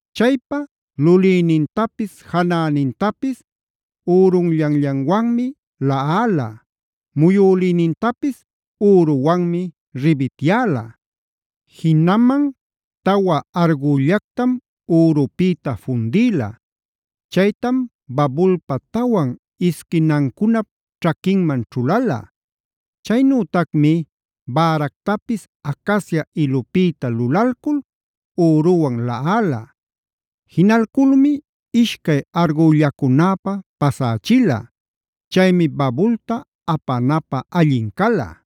Chaypa lulïnintapis janänintapis ürunllanllanwanmi laꞌala; muyülïnintapis üruwanmi ribityäla. Jinaman tawa argüllactam ürupïta fundïla. Chaytam babulpa tawan isquinancunap ćhaquinman ćhulala. Chaynütacmi bäractapis acacia ilupïta lulalcul üruwan laꞌala. Jinalculmi ishcay argüllacunäpä pasächila. Chaymi babulta apanapä allin cala.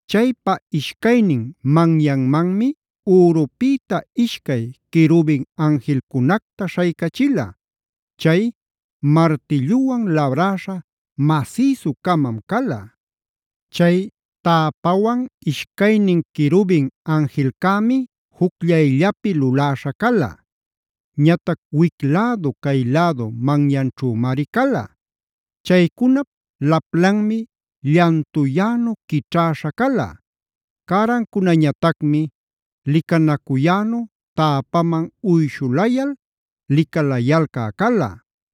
Chaypa ishcaynin manyanmanmi ürupïta ishcay querubin anjilcunacta śhaycachila. Chay martilluwan labräśha masïsu-camam cala. Chay täpawan ishcaynin querubin anjilcämi jucllayllapi luläśha cala. Ñatac wic-lädu cay-lädu manyanćhümari cala. Chaycunap laplanmi llantuyänu quićhäśha cala. Cärancunañatacmi licanacuyänu täpaman uyshulayal licalayalcä cala.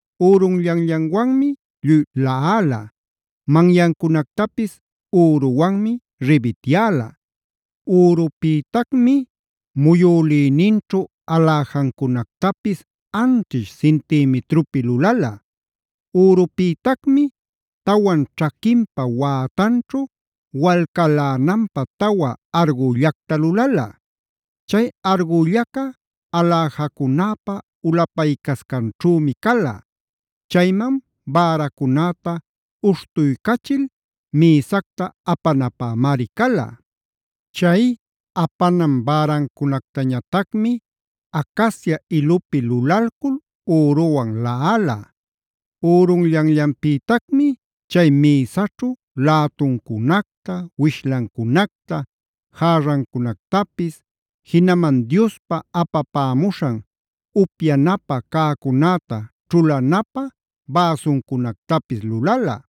Ürunllanllanwanmi lluy laꞌala, manyancunactapis üruwanmi ribityäla. Ürupïtacmi muyülïninćhu aläjancunactapis anćhish cintimitrupi lulala. Ürupïtacmi tawan ćhaquinpa wätanćhu walcalänanpä tawa argüllacta lulala. Chay argüllaca aläjacunäpa ulapaycascanćhümi cala. Chayman bäracunäta uśhtuycachil mïsacta apanapämari cala. Chay apanan bäracunactañatacmi acacia ilupi lulalcul üruwan laꞌala. Ürunllanllanpïtacmi chay mïsaćhu lätuncunacta, wishlancunacta, järrancunactapis, jinaman Diospa apapämuśhan upyanapä cäcunäta ćhulanapä bäsuncunactapis lulala.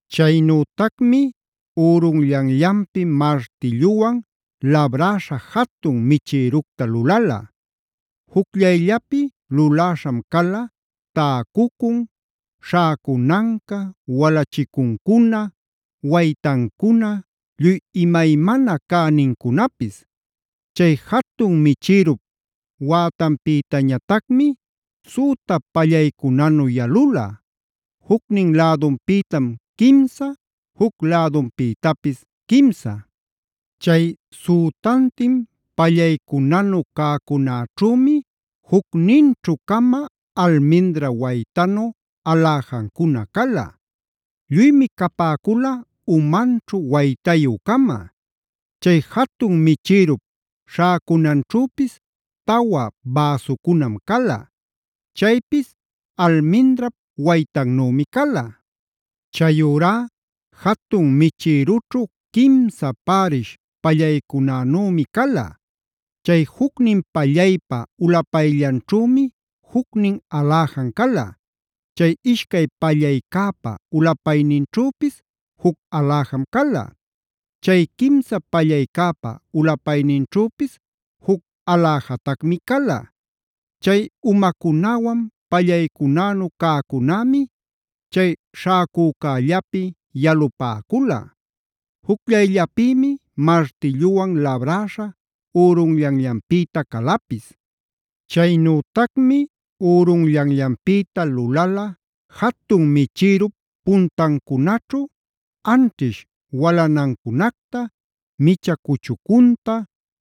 Chaynütacmi ürunllanllanpi martilluwan labräśha jatun michïructa lulala. Jucllayllapi luläśham cala täcucun, śhäcunanca, walachicuncuna, waytancuna lluy imaymana cänincunapis. Chay jatun michïrup wätanpïtañatacmi süta pallaycunanu yalula. Jucnin lädunpïtam quimsa, juc lädunpïtapis quimsa. Chay sütantin pallaycunanu cäcunäćhümi jucninćhu-cama almindra waytanu aläjancuna cala. Lluymi capäcula umanćhu waytayü-cama. Chay jatun michïrup śhäcunanćhüpis tawa bäsucunam cala. Chaypis almindrap waytannümi cala. Chayurá jatun michïrućhu quimsa pärish pallaycunanümi cala. Chay jucnin pallaypa ulapayllanćhümi jucnin aläjan cala. Chay ishcay pallaycäpa ulapayninćhüpis juc aläjam cala. Chay quimsa pallaycäpa ulapayninćhüpis juc aläjatacmi cala. Chay umacunäwan pallaycunänu cäcunämi chay śhäcücällapi yalupäcula. Jucllayllapïmi martilluwan labräśha ürunllanllanpïta calapis. Chaynütacmi ürunllanllanpïta lulala jatun michïrup puntancunaćhu anćhish walanancunacta, micha cuchucunta,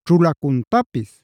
ćhulacuntapis.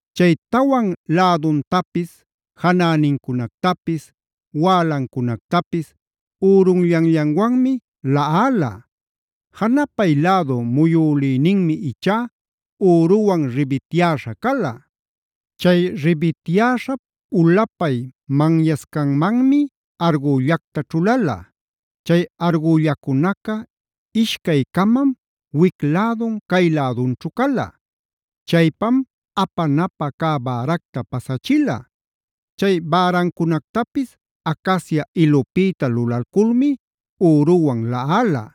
Chay tawan läduntapis, janänincunactapis, wälancunactapis ürunllanllanwanmi laꞌala. Janapay lädu muyülïninmi ichá üruwan ribityäśha cala. Chay ribityäśhap ulapay manyancascanmanmi argüllacta ćhulala. Chay argüllacunaca ishcay-camam wic lädun cay lädunćhu cala. Chaypam apanapä cä bäracta pasachila. Chay bärancunactapis acacia ilupïta lulalculmi üruwan laꞌala.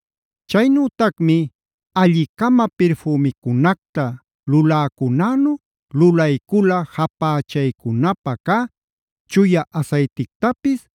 Chaynütacmi alli-cama pirfümicunacta luläcunänu lulaycula japächaycunapä cä chuya asaytictapis,